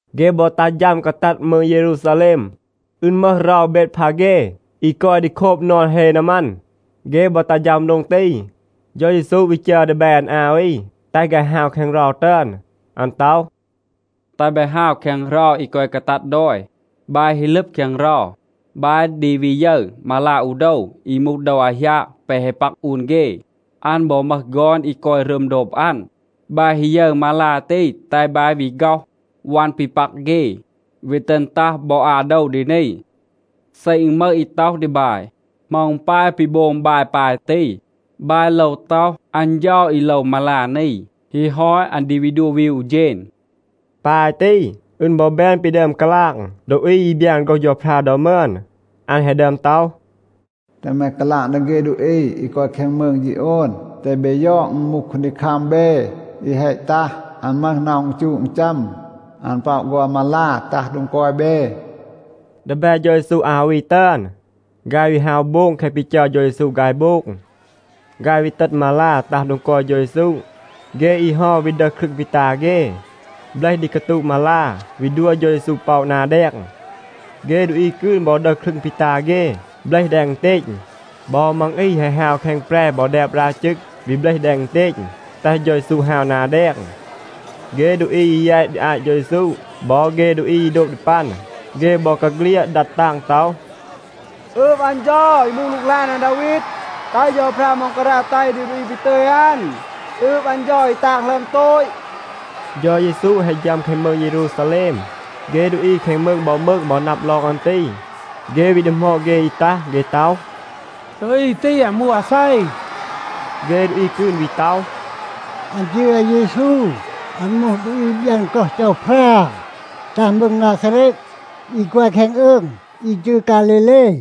เฆ บอ ตัห ฌัม กาตัด มืง เยรูซาแลม. อึณ มึห เรา เบดพาเฆ, อี กอย ดี โคบ นอน เฮ นามัน. เฆ บอ ตัห ฌัม โดง ตี, เฌา เยซู วี จัร ดีแบ อัน อา วี, แตห ฆาย ฮาว แคง เรา ตึอน. อัน ต็อห, “แตห บาย ฮาว แคง เรา อี กอย กาตัด ดอย. บาย ฮี ลึบ แคง เรา, บาย ดี วี ยึร มาลา อู โดว อี มูห โดว อาหยาง แปะ แฮะ ปัก อูน เฆ. อัน บอ มึห ฆอน อี กอย รึม โดบ อัน. บาย ฮี ยึร มาลา ตี, แตห บาย วี ฆ็อห วัน ปี ปัก เฆ, วี ตึณ ตัห บอ อา โดว ดี นี. เซ อึณ มึห อี ต็อห ดี บาย, ‘เหมา อึณ ปาย ปี โบง บาย ปาย ตี,’ บาย โลว ต็อห, ‘อัน เฌา อี โลว มาลา นี. ฮี ฮอต, อัน ดี วี ดัว วีว อู เฌณ.’” ปาย ตี, อึณ บอ แบน ปี ดึอม กาลาง ดูอี อี บยาน โฆรห เฌาพรา ดอ มึอน. อัน แฮะ ดึอม ต็อห, “แตห แม กาลาง ดี เฆ ดูอี อี กอย แคง มืง ฌีโอนa ‘แตห เบ ยอด, อึณ มูห คูนดีคัม เบ, อี แฮะ ตัห. อัน มึห น็อห อึณจูะ อึณจัม. อัน ป็อะ ฆอน มาลา, ตัห โดง กอย เบ.’” ดีแบ เฌา เยซู อา วี ตึอน, ฆาย วี ฮาว โบง แคะ ปี จัร เฌา เยซู ฆาย โบง. ฆาย วี ตึณ มาลา ตัห โดง กอย เฌา เยซู. เฆ อี เฮา วี ดึห ครึง ปี ตา เฆ, เบลห ดี กาตูะ มาลา, วี ดัว เฌา เยซู ป็อะ นา แดง. เฆ ดูอี กืน บอ ดึห ครึง ปี ตา เฆ, เบลห แดง อึณเตณ. บอ มัง อี แฮะ ฮาว แคง แปร บอ แดบ รา จึก, วี เบลห แดง อึณเตณ, แตห เฌา เยซู ฮาว นา แดง. เฆ ดูอี อี แยต ดี อาต เฌา เยซู บอ เฆ ดูอี อี โดบ ดี ปัน, เฆ บอกาเฆลียด ดัด ตาง ต็อห, “อืบ อัน เฌา, อี มูห หลูกหลาน อาดาวีด. แตห เฌาพรา ม็องการา แตห ดี ดูอี ปี ตึย อัน. อืบ อัน เฌา อี ตาง หลึอม โตต.” เฌา เยซู แฮะ ฌัม แคง มืง เยรูซาแลม, เฆ ดูอี แคง มืง บอ มืง บอ นับ ลอง อัน ตี. เฆ วี ดีหมอด เฆ อี ตัห. เฆ ต็อห, “ดูอี ตี, อัน มูห อาเซ?” เฆ ดูอี กืน วี ต็อห, “อัน จืร อาเยซู. อัน มูห ดูอี อี บยาน โฆรห เฌาพรา ตัห มืง นาซาเรต, อี กอย แคง อืง อี จืร ฆาลีเล.”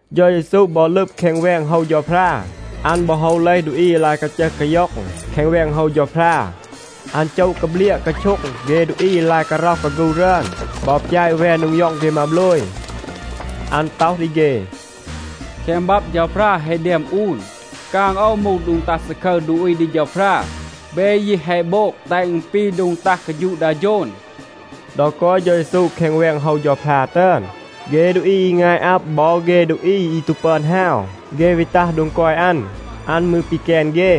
เฌา เยซู บอ ลึบ แคง แวง โฮว เฌาพรา. อัน บอ โฮว เลห ดูอี อี ลาย กาจึห กาย็อง แคง แวง โฮว เฌาพรา. อัน โจะ กาเบลียะ กาโช็ง เฆ ดูอี อี ลาย การ็อห กาฆู รึอน บอ ปยาต แวน โดง ย็อง เฆ มาโบลย. อัน ต็อห ดี เฆ, “แคง บับ เฌาพรา แฮะ แดม อูน, ‘กาง โอว มูห โดง ตัห ซาคึร ดูอี ดี เฌาพรา.’ เบ ยี แฮะ โบง แตห อึณ ปี โดง ตัห กาฌูะ ดา โฌน.” ดอ กอย เฌา เยซู แคง แวง โฮว เฌาพรา ตึอน, เฆ ดูอี อี งาย อับ บอ เฆ ดูอี อี ตู ปึอน ฮาว, เฆ วี ตัห โดง กอย อัน. อัน มืร ปีแกน เฆ.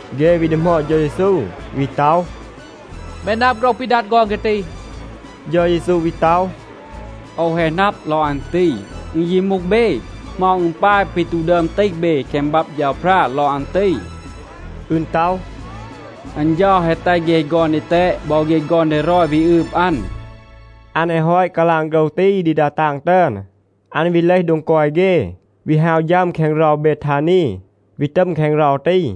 เฆ วี ดีหมอด เฌา เยซู, วี ต็อห, “แม นับ โฆรห ปี ดัด ฆอน เฆ ตี?” เฌา เยซู วี ต็อห, “โอว แฮะ นับ ลอง อัน ตี. อึณ ยี มูห เบ. เหมา อึณ ปาย ปี ตู ดึอม ตีห เบ แคง บับ เฌาพรา ลอง อัน ตี? อึณ ต็อห, ‘อัน เฌา แฮะ แตห เฆ ฆอน ดีแตด บอ เฆ ฆอน ดีรอย วี อืบ อัน.’” อัน แฮะ ฮอต กาลาง โฆรห ตี ดี ดา ตาง ตึอน, อัน วี เลห โดง กอย เฆ, วี ฮาว ฌัม แคง เรา เบทานี, วี ตัม แคง เรา ตี.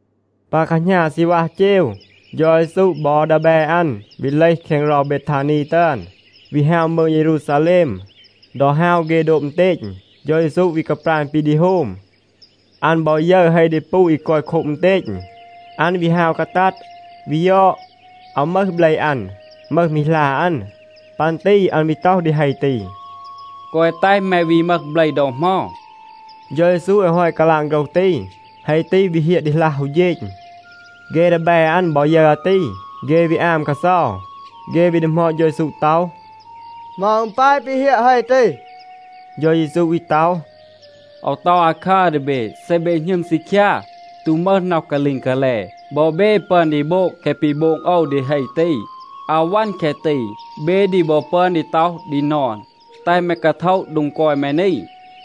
ปา แคหณา ซีณวัห เจว, เฌา เยซู บอ ดีแบ อัน วี เลห แคง เรา เบทานี ตึอน, วี ฮาว มืง เยรูซาแลม. ดอ ฮาว เฆ โดบ อึณเตณ, เฌา เยซู วี กาปราณ ปี ดี โฮม. อัน บอ ยึร เฮ ดีปู อี กอย โคบ อึณเตณ. อัน วี ฮาว กาตัด, วี ยอด, อาว มึห เบล อัน. มึห มี หลา อัน. ปัน ตี อัน วี ต็อห ดี เฮ ตี, “แกวะ แตห แม วี มึห เบล ดอ เหมา.” เฌา เยซู แฮะ ฮอต กาลาง โฆรห ตี, เฮ ตี วี เฮียะ ดีหลัห อู เฌณ. เฆ ดีแบ อัน บอ ยึร อาตี, เฆ วี อาม กาเซา. เฆ วี ดีหมอด เฌา เยซู ต็อห, “เหมา อึณ ปาย ปี เฮียะ เฮ ตี?” เฌา เยซู วี ต็อห, “โอว ต็อห อาคัร ดี เบ. เซ เบ หณึม ซีคยา, ตู มึห น็อห กาลีง กาแล, บอ เบ ปึอน ดี โบง แคะ ปี โบง โอว ดี เฮ ตี. อาว วัน แคะ ตี. เบ ดี บอ ปึอน ดี ต็อห ดี นอน, ‘แตห แม กาโทะ โดง กอย แม นี,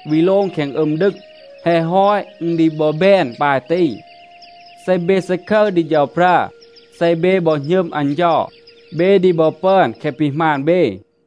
วี โลง แคง อึม ดึง.’ แฮะ ฮอต, อึณ ดี บอ แบน ปาย ตี. เซ เบ ซาคึร ดี เฌาพรา, เซ เบ บอ หณึม อัน เฌา, เบ ดี บอ ปึอน แคะ ปี หมาณ เบ.”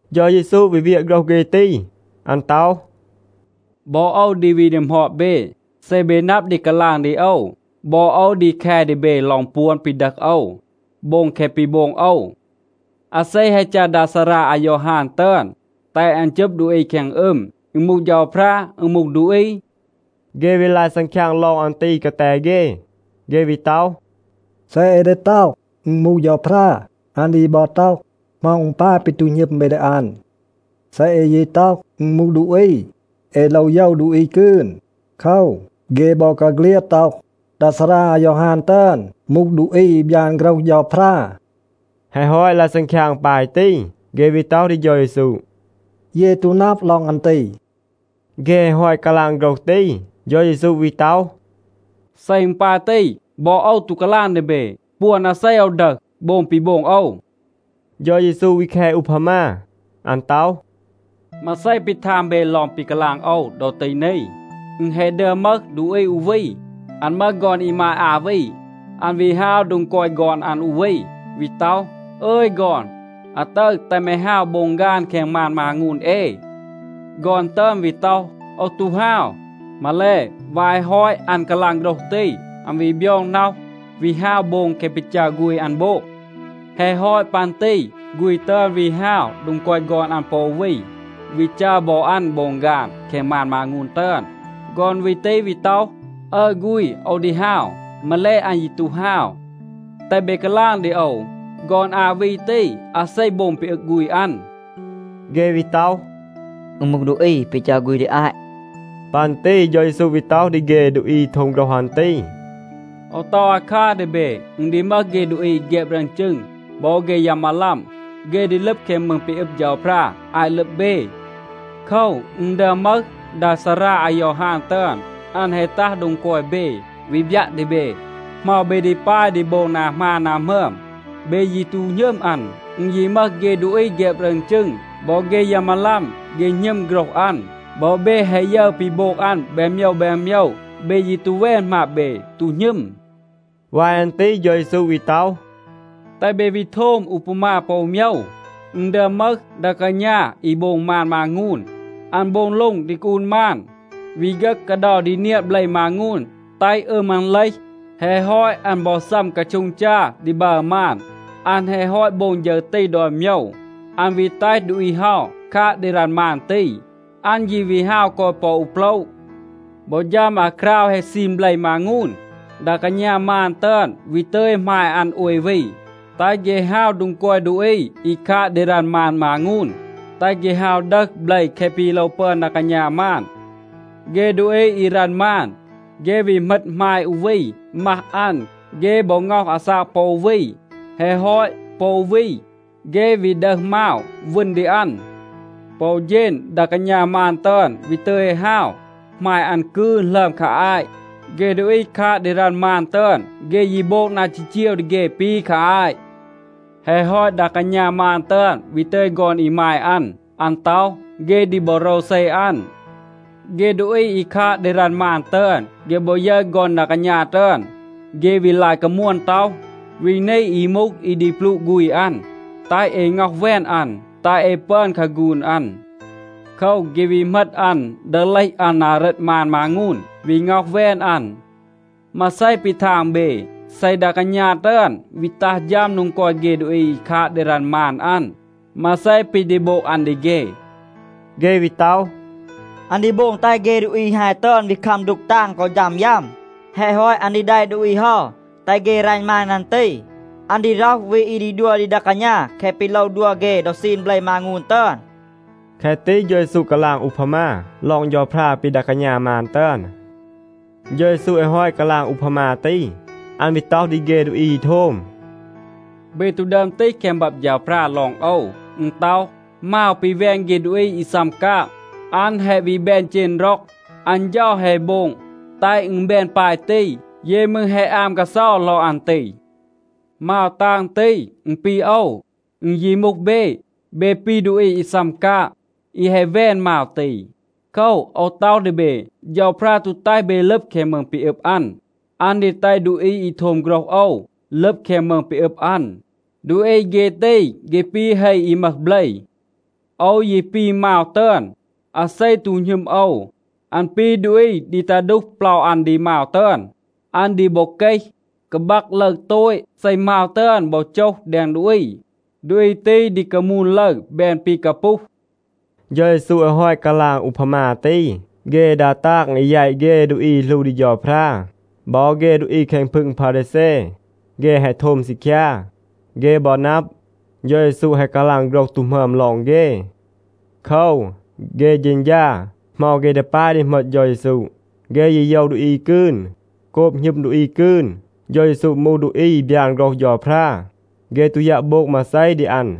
เฌา เยซู วี เวียะ โฆรห เฆ ตี. อัน ต็อห, “บอ โอว ดี วี ดีหมอด เบ. เซ เบ นับ ดี กาลาง ดี โอว, บอ โอว ดี แค ดี เบ ลอง ปวน ปี ดึห โอว, โบง แคะ ปี โบง โอว. อาเซ แฮะ จัร ดา ซารา อายอฮาน ตึอน, แตห อัน จึบ ดูอี แคง อึม? อึณ มูห เฌาพรา? อึณ มูห ดูอี?” เฆ วี ลาย ซังคยาง ลอง อัน ตี กาแต เฆ. เฆ วี ต็อห, “เซ เอ ดี ต็อห, ‘อึณ มูห เฌาพรา,’ อัน ดี บอ ต็อห, ‘เหมา อึณ ปาย ปี ตู หณึม เบ ดี อัน?’ เซ เอ ยี ต็อห, ‘อึณ มูห ดูอี’ เอ โลว โยว ดูอี กืน. โคว, เฆ บอกาเฆลียด ต็อห, ดา ซารา อายอฮาน ตึอน มูห ดูอี อี บยาน โฆรห เฌาพรา.” แฮะ ฮอต ลาย ซังคยาง ปาย ตี, เฆ วี ต็อห ดี เฌา เยซู, “เย ตู นับ ลอง อัน ตี.” เฆ แฮะ ฮอต กาลาง โฆรห ตี, เฌา เยซู วี ต็อห, “เซ อึณ ปาย ตี, บอ โอว ตู กาลาง ดี เบ ปวน อาเซ โอว ดึห, โบง ปี โบง โอว.” เฌา เยซู วี แค อูพามา. อัน ต็อห, “มาเซ ปี ทาง เบ ลอง ปี กาลาง โอว ดอ ตี นี? อึณ แฮะ ดึอม มึห ดูอี อู วี. อัน มึห ฆอน อีมาย อา วี. อัน วี ฮาว โดง กอย ฆอน อัน อู วี, วี ต็อห, ‘อึย ฆอน, อาตึร แตห แม ฮาว โบง ฆาน แคง มาน มางูน เอ.’ ฆอน ตึอน วี ต็อห, ‘โอว ตู ฮาว.’ มาแล, วาย แฮะ ฮอต อัน กาลาง โฆรห ตี, อัน วี บยอง น็อห, วี ฮาว โบง แคะ ปี จัร ฆูณ อัน โบง. แฮะ ฮอต ปัน ตี ฆูณ ตึอน วี ฮาว โดง กอย ฆอน อัน ปอ อู วี, วี จัร บอ อัน โบง ฆาน แคง มาน มางูน ตึอน. ฆอน วี ตี วี ต็อห, ‘อึร ฆูณ, โอว ดี ฮาว.’ มาแล, อัน ยี ตู ฮาว. แตห เบ กาลาง ดี โอว, ฆอน อา วี ตี, อาเซ โบง ปี อึง ฆูณ อัน?” เฆ วี ต็อห, “อึณ มูห ดูอี ปี จัร ฆูณ ดี อาต.” ปัน ตี เฌา เยซู วี ต็อห ดี เฆ ดูอี อี โทม โฆรห อัน ตี, “โอว ต็อห อาคัร ดี เบ. อึณ ดี มึห เฆ ดูอี อี แฆบ รึอน จึง บอ เฆ ยา มาลัม, เฆ ดี ลึบ แคง มืง ปี อึบ เฌาพรา อาต ลึบ เบ. โคว, อึณ ดึอม มึห ดา ซารา อายอฮาน ตึอน. อัน แฮะ ตัห โดง กอย เบ, วี บยัะ ดี เบ เหมา เบ ดี ปาย ดี โบง นา หมาน นา หมึอม. เบ ยี ตู หณึม อัน. อึณ ยี มึห เฆ ดูอี แฆบ รึอน จึง บอ เฆ ยา มาลัม, เฆ หณึม โฆรห อัน. บอ เบ แฮะ ยึร ปี โบง อัน แบน โมยว แบน โมยว, เบ ยี ตู แวน หมาบ เบ, ตู หณึม.” วาย อัน ตี เฌา เยซู วี ต็อห, “แตห เบ วี โทม อูพามา ปอ อู โมยว. อึณ ดึอม มึห ดา กาณา อี โบง มาน มางูน. อัน โบง โล็ง ดี กาอูน มาน, วี ฆึห กาเดา ดี เนียะ เบล มางูน, แตห อึม อัน เลห. แฮะ ฮอต, อัน บอ ซัม กาโช็ง จา ดี บัร มาน. อัน แฮะ ฮอต โบง ฌึร ตี ดอน โมยว, อัน วี แตห ดูอี เฮา คาด ดี รัณ มาน ตี. อัน ยี วี ฮาว กอย ปอ อู โปละ. บอ ฌัม อาคราว แฮะ ซีน เบล มางูน, ดา กาณา มาน ตึอน วี ตึย หมาย อัน โอย วี, แตห เฆ ฮาว โดง กอย ดูอี อี คาด ดี รัณ มาน มางูน, แตห เฆ ฮาว ดึห เบล แคะ ปี โลว ปึอน ดา กาณา มาน. เฆ ดูอี อี รัณ มาน, เฆ วี เหมต หมาย อู วี, มัห อัน. เฆ บอ ง็อห อาซาก ปอ อู วี. แฮะ ฮอต, ปอ อู วี, เฆ วี ดึห มาว, วึณ ดี อัน. ปอ อู เฌณ ดา กาณา มาน ตึอน วี ตึย ฮาว หมาย อัน กืน หลึอม คา อาต. เฆ ดูอี คาด ดี รัณ มาน ตึอน, เฆ ยี โบง นา จีจีว ดี เฆ ปี คา อาต. แฮะ ฮอต, ดา กาณา มาน ตึอน วี ตึย ฆอน อีมาย อัน. อัน ต็อห, ‘เฆ ดี บอ โรวเซ อัน.’ เฆ ดูอี อี คาด ดี รัณ มาน ตึอน, เฆ บอ ยึร ฆอน ดา กาณา ตึอน, เฆ วี ลาย กามวน ต็อห, ‘วี นี อี มูห อี ดี ปลูะ ฆูณ อัน. แตห เอ ง็อห แวน อัน, แตห เอ ปึอน คาฆูน อัน.’ โคว, เฆ วี เหมต อัน, ดึห เลห อัน นา เรต มาน มางูน, วี ง็อห แวน อัน. มาเซ ปี ทาง เบ? เซ ดา กาณา ตึอน วี ตัห ฌัม โดง กอย เฆ ดูอี อี คาด ดี รัณ มาน อัน, มาเซ ปี ดี โบง อัน ดี เฆ?” เฆ วี ต็อห, “อัน ดี โบง แตห เฆ ดูอี ฮาย ตึอน วี คัม ดูก ตาง กอ ฌัม ยัม. แฮะ ฮอต อัน ดี แดะ ดูอี เฮา, แตห เฆ รัณ มาน อัน ตี. อัน ดี ร็อห วี อี ดี ดัว ดี ดา กาณา แคะ ปี โลว ดัว เฆ ดอ ซีน เบล มางูน ตึอน.” แคะ ตี เฌา เยซู กาลาง อูพามา ลอง เฌาพรา ปี ดา กาณา มาน ตึอน. เฌา เยซู แฮะ ฮอต กาลาง อูพามา ตี, อัน วี ต็อห ดี เฆ ดูอี อี โทม, “เบ ตู ดึอม ตีห แคง บับ เฌาพรา ลอง โอว? อึณ ต็อห, ‘มาว ปี แวน เฆ ดูอี อี ซัม กาง, อัน แฮะ วี แบน เจณ ร็อง. อัน เฌา แฮะ โบง, แตห อึณ แบน ปาย ตี. เย มืร แฮะ อาม กาเซา ลอง อัน ตี.’ มาว ตาง ตี, อึณ ปี โอว. อึณ ยี มูห เบ, เบ ปี ดูอี อี ซัม กาง, อี แฮะ แวน มาว ตี. โคว, โอว ต็อห ดี เบ, เฌาพรา ตู แตห เบ ลึบ แคง มืง ปี อึบ อัน. อัน ดี แตห ดูอี อี โทม โฆรห โอว ลึบ แคง มืง ปี อึบ อัน. ดูอี เฆ ตี, เฆ ปี เฮ อี มึห เบล. โอว ยี ปี มาว ตึอน. อาเซ ตู หณึม โอว, อัน ปี ดูอี ดี ตา ดูห เปลา อัน ดี มาว ตึอน. อัน ดี บอ เกห, กาบัก ลึร โตต. เซ มาว ตึอน บอ โจห แดง ดูอี, ดูอี ตี ดี กามูน ลึร, แบน ปี กาปูห.” เฌา เยซู แฮะ ฮอต กาลาง อูพามา ตี, เฆ ดา ตาง อี แยต เฆ ดูอี อี หลู ดี เฌาพรา บอ เฆ ดูอี แคง พึง พารีแซ, เฆ แฮะ โทม ซีคยา. เฆ บอ นับ, เฌา เยซู แฮะ กาลาง โฆรห ตู หมึอม ลอง เฆ. โคว, เฆ เฌณฌา, เหมา เฆ ดี ปาย ดี เหมต เฌา เยซู. เฆ ยี โยว ดูอี กืน. โกบ หณึม ดูอี กืน, เฌา เยซู มูห ดูอี อี บยาน โฆรห เฌาพรา, เฆ ตู ยัะ โบง มาเซ ดี อัน.